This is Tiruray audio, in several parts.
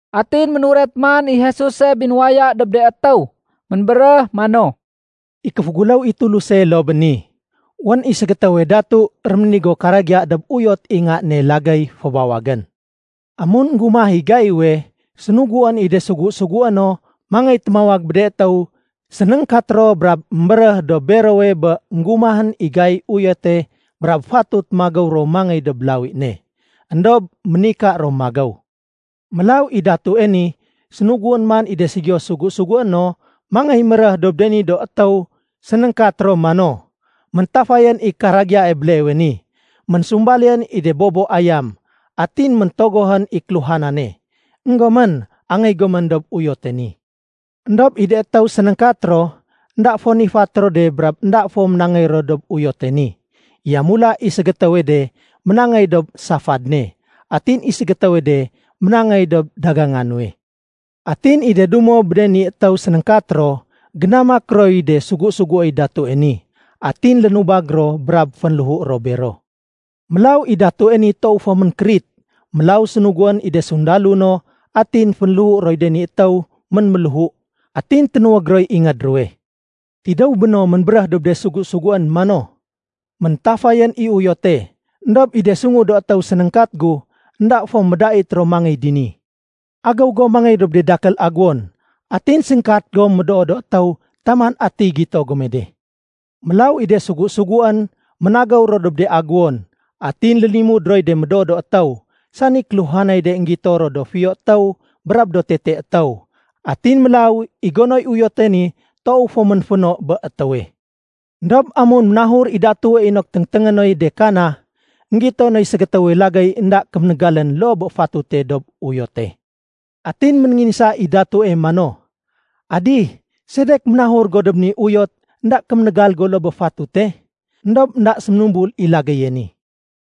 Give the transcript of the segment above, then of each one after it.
Atin ménuret man i Jesuse binuwaya dob de étéw. Ménbéréh mano, “I kéféguléw i Tuluse loo bé ni. Wén i ségétéwe datu réménigo karagiya dob uyot i nga ne lagéy fébawagén. Amun énggumah i gaiwe, sénuguén i de sugu-sugué no mangéy témawag bé de étéw sénéngkat ro brab émbéréh dob berowe bé énggumahén i gaiy uyote brab fatut magéw ro mangéy dob lawi ne. Endob ménika ro magéw. Mélaw i datue ni sénuguén man i de ségiyo sugu-sugué no mangéy méréh dob de ni do étéw sénéngkat ro mano, ‘Méntafayén i karagiyae béleewe ni. Ménsumbalién i de bobo ayam atin méntogohén i kéluhanane. Enggomén, angéy gomén dob uyote ni.’ Endob i de étéw sénéngkat ro, énda fo nifat ro de brab énda fo ménangéy ro dob uyote ni. Yamula i ségétéwe de ménangéy dob safad ne, atin i ségétéwe de ménangéy dob daganga nuwe. Atin i de dumo bé de ni étéw sénéngkat ro génamak roy de sugu-suguéy datue ni. Atin lénubag ro brab fénléhu ro bero. Mélaw i datue ni toow fo ménkérit. Mélaw sénuguén i de sundalo no atin fénléhu roy de ni étéw ménméléhu, atin ténuwég roy ingéd ruwe. Tidéw béno, ménbéréh dob de sugu-suguén mano, ‘Méntafayén i uyote, éndob i de sungu do étéw sénéngkat gu énda fo médait ro mangéy dini. Agéw gom mangéy dob de dakél aguwon atin séngkat gom médoo do étéw taman atiy gito gome de.’ Mélaw i de sugu-suguén ménagéw ro dob de aguwon atin lénimud roy de médoo do étéw, sani kéluhanay de énggito ro do fiyo étéw brab do tete étéw. Atin mélaw i gonoy uyote ni toow fo ménféno bé étéwe. Endob amun ménahur i datue inok téngténgé noy de kana, énggito noy ségétéwe lagéy énda kéménégalén loo bé fatute dob uyote. Atin ménénginsa i datue mano, ‘Adih, sedek ménahur go dob ni uyot énda kéménégal go loo bé fatute?’ Endob énda séménumbul i lagéye ni.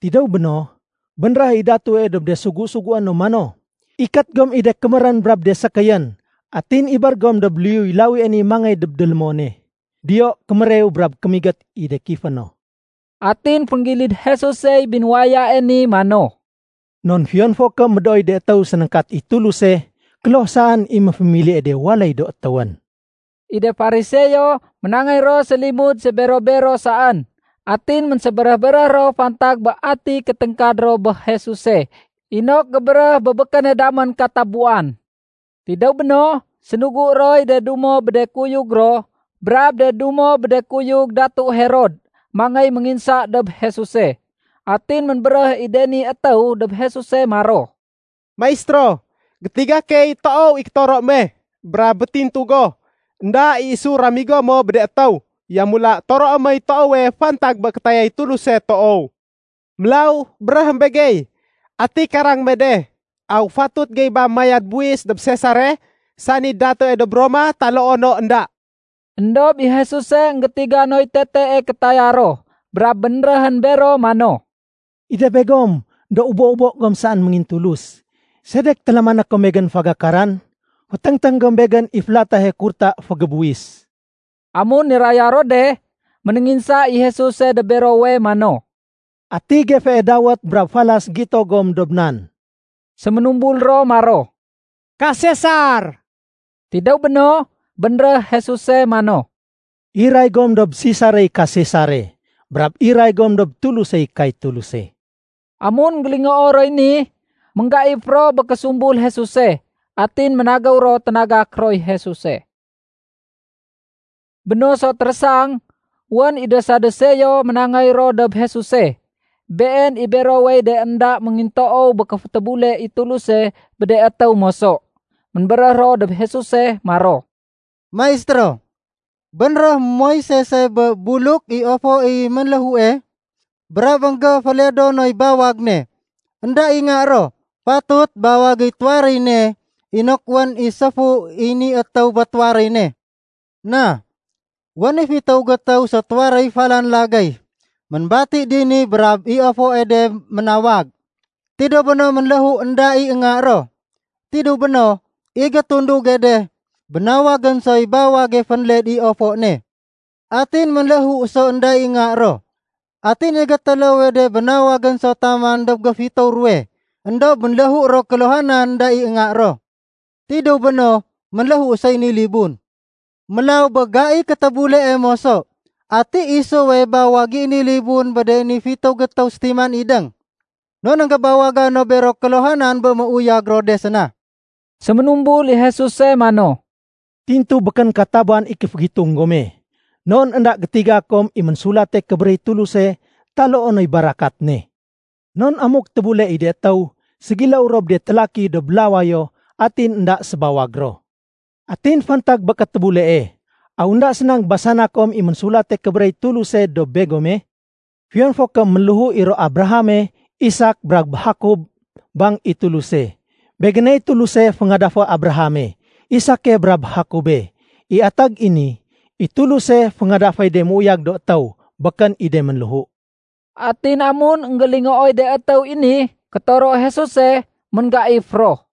Tidéw béno, bénréh i datue dob de sugu-sugué no mano, ‘Ikét gom i de kémérén brab de sékéyén, atin ibér gom dob liyuy lawie ni mangéy dob délémone. Diyo kémérew brab kémigét i de kifé no.’” Atin fénggilid Jesusey binuwayae ni mano, “Non fiyon fo ké médooy de étéw sénéngkat i Tuluse, kloh saén i méfémilie de waléy do étéwén.” I de Fariseo, ménangéy ro sélimud sébero-bero saén. Atin ménsébéréh-béréh ro fantag bé ati kéténgkad ro bé Jesuse inok gébéréh bé békéne damén katabuwan. Tidéw béno, sénugu roy de dumo bé de kuyug ro brab de dumo bé de kuyug Datu Herod mangéy ménginsa dob Jesuse. Atin ménbéréh i de ni étéw dob Jesuse maro, “Maistéro, gétiga key toow i kétoro me. Brab métintu go, énda i isu ramigo mo bé de étéw. Yamula toroé moy toowe fantag bé kétayay Tuluse toow. Mélaw béréhém begey, ati karang me de, aw fatut gey ba mayad buwis dob Sesare, sani datue dob Roma taloo no énda?” Endob i Jesuse énggétiga noy tetee kétaya ro brab bénréhén bero mano, “I de begom do ubo-ubo gom saén méngintulus. Sedek télamané kom Begén fagakaran? Féténgténg gom Begén i félatahe kurta fégébuwis.” Amun niraya ro de, ménénginsa i Jesuse dob berowe mano, “Ati gefee dawét brab falas gito gom dob nan?” Séménumbul ro maro, “Ka Sesar.” Tidéw béno, bénréh Jesuse mano, “Iray gom dob Sesarey ka Sesare. Brab iray gom dob Tulusey kay Tuluse.” Amun énggélingoo roy ni, ménggaif ro bé késumbul Jesuse. Atin ménagéw ro ténagak roy Jesuse. Bé no so térésang, wén i de Saduseo ménangéy ro dob Jesuse. (Been i berowey de énda méngintoow bé kéfétébule i Tuluse bé de étéw moso.) Ménbéréh ro dob Jesuse maro, “Maistéro, bénréh Moisese bé buluk i ofo i ménléhue, brab énggéféledo noy bawag ne, énda i nga ro, fatut bawagéy tuwaréy ne inok wén i séfu i ni étéw bé tuwaréy ne. Na, wén i fitéw gétéw sétuwaréy falan lagéy ménbati dini Brab i ofoe de ménawag. Tidéw béno, ménléhu énda i nga ro. Tidéw béno, i gétunduge de bénawagén soy bawage fénled i ofo ne. Atin ménléhu so énda i nga ro. Atin i gétéléwe de bénawagén so taman dob géfitéw ruwe. Endob ménléhu ro kéluhanan énda i nga ro. Tidéw béno, ménléhu soy ni libun. Mélaw bé gaiy kétébulee moso, ati isuwe bawag i ni libun bé de ni fitéw gétéw sétiman idéng? Non énggébawaga no bero kéluhanan bé méuyag ro de séna.” Séménumbul i Jesuse mano, “Tintu békén katabuwan i kéfégitung gome. Non énda gétiga kom i Ménsulate Kébéréh i Tuluse taloo noy barakat ne. Non amuk tébule i de étéw, ségiléw ro bé de télaki dob lawayo atin énda sébawag ro. Atin fantag bé kétébulee, aw énda séna énggébasana kom i Ménsulate Kébéréh i Tuluse dob begome? Fiyon fo ké ménléhu i ro Abrahame, Isak, brab Jakob, bang i Tuluse, ‘Begéney Tuluse féngadafé Abrahame, Isake, brab Jakobe.’ I atag i ni, i Tuluse féngadaféy de méuyag do étéw, békén i de ménléhu.” Atin amun énggélingooy de étéw i ni kétoro Jesuse, ménggaif ro.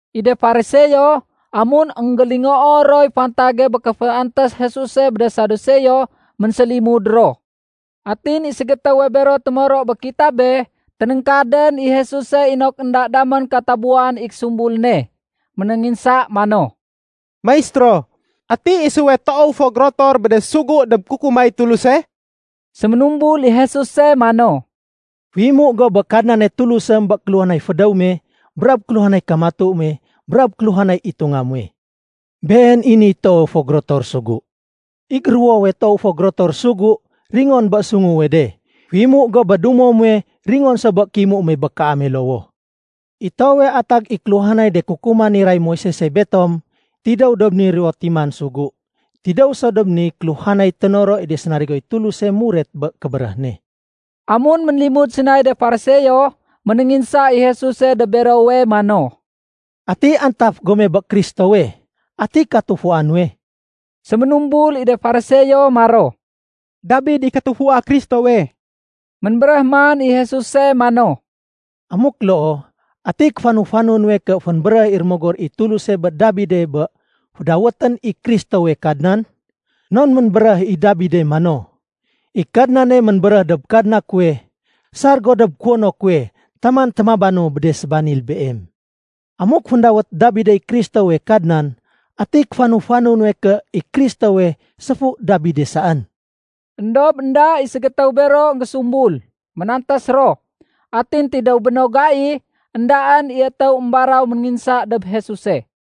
I de Fariseo, amun énggélingoo roy fantage bé kéféantés Jesuse bé de Saduseo, ménsélimud ro. Atin i ségétéwe bero témoro bé kitabe, ténéngkadén i Jesuse inok énda damén katabuwan i késumbul ne. Ménénginsa mano, “Maistéro, ati isuwe toow fo gérotor bé de sugu dob kukumay Tuluse?” Séménumbul i Jesuse mano, “Féimu go bé Kadnane Tulusém bé kéluhanay fédéw me, brab kéluhanay kamatu me, brab kéluhanay itunga muwe. Been i niy toowe fo gérotor sugu. I géruwowe toow fo gérotor sugu ringon so bé sunguwe de. Féimu go bé dumo muwe ringon so bé kéimu me bé kaame lowoh. I toowe atag i kéluhanay de kukuman niray Moisese betom tidéw dob ni ruwo timan sugu. Tidéw so dob niy kéluhanay ténoro i de sénarigoy Tuluse muret bé kébéréh ne.” Amun ménlimud sénay de Fariseo, ménénginsa i Jesuse dob berowe mano, “Ati antaf gom bé Kristowe? Ati katufua nuwe?” Séménubul i de Fariseo maro, “Dabid i katufua Kristowe.” Ménbéréh man i Jesuse mano, “Amuk loo, ati kéfanu-fanu nuwe ké fénbéréh i Rémogor i Tuluse bé Dabide bé fédawétén i Kristowe ‘Kadnan?’ Non ménbéréh i Dabide mano, ‘I Kadnane ménbéréh dob Kadna kuwe, sar go dob kuwono kuwe taman témabanu bé de sébanil Beem.’ Amuk féndawét Dabidey Kristowe ‘Kadnan’, ati kéfanu-fanu nuwe ké i Kristowe séfu Dabide saén?” Endob énda i ségétéw bero énggésumbul, ménantés ro. Atin tidéw bé no gai, éndaén i étéw émbaraw ménginsa dob Jesuse.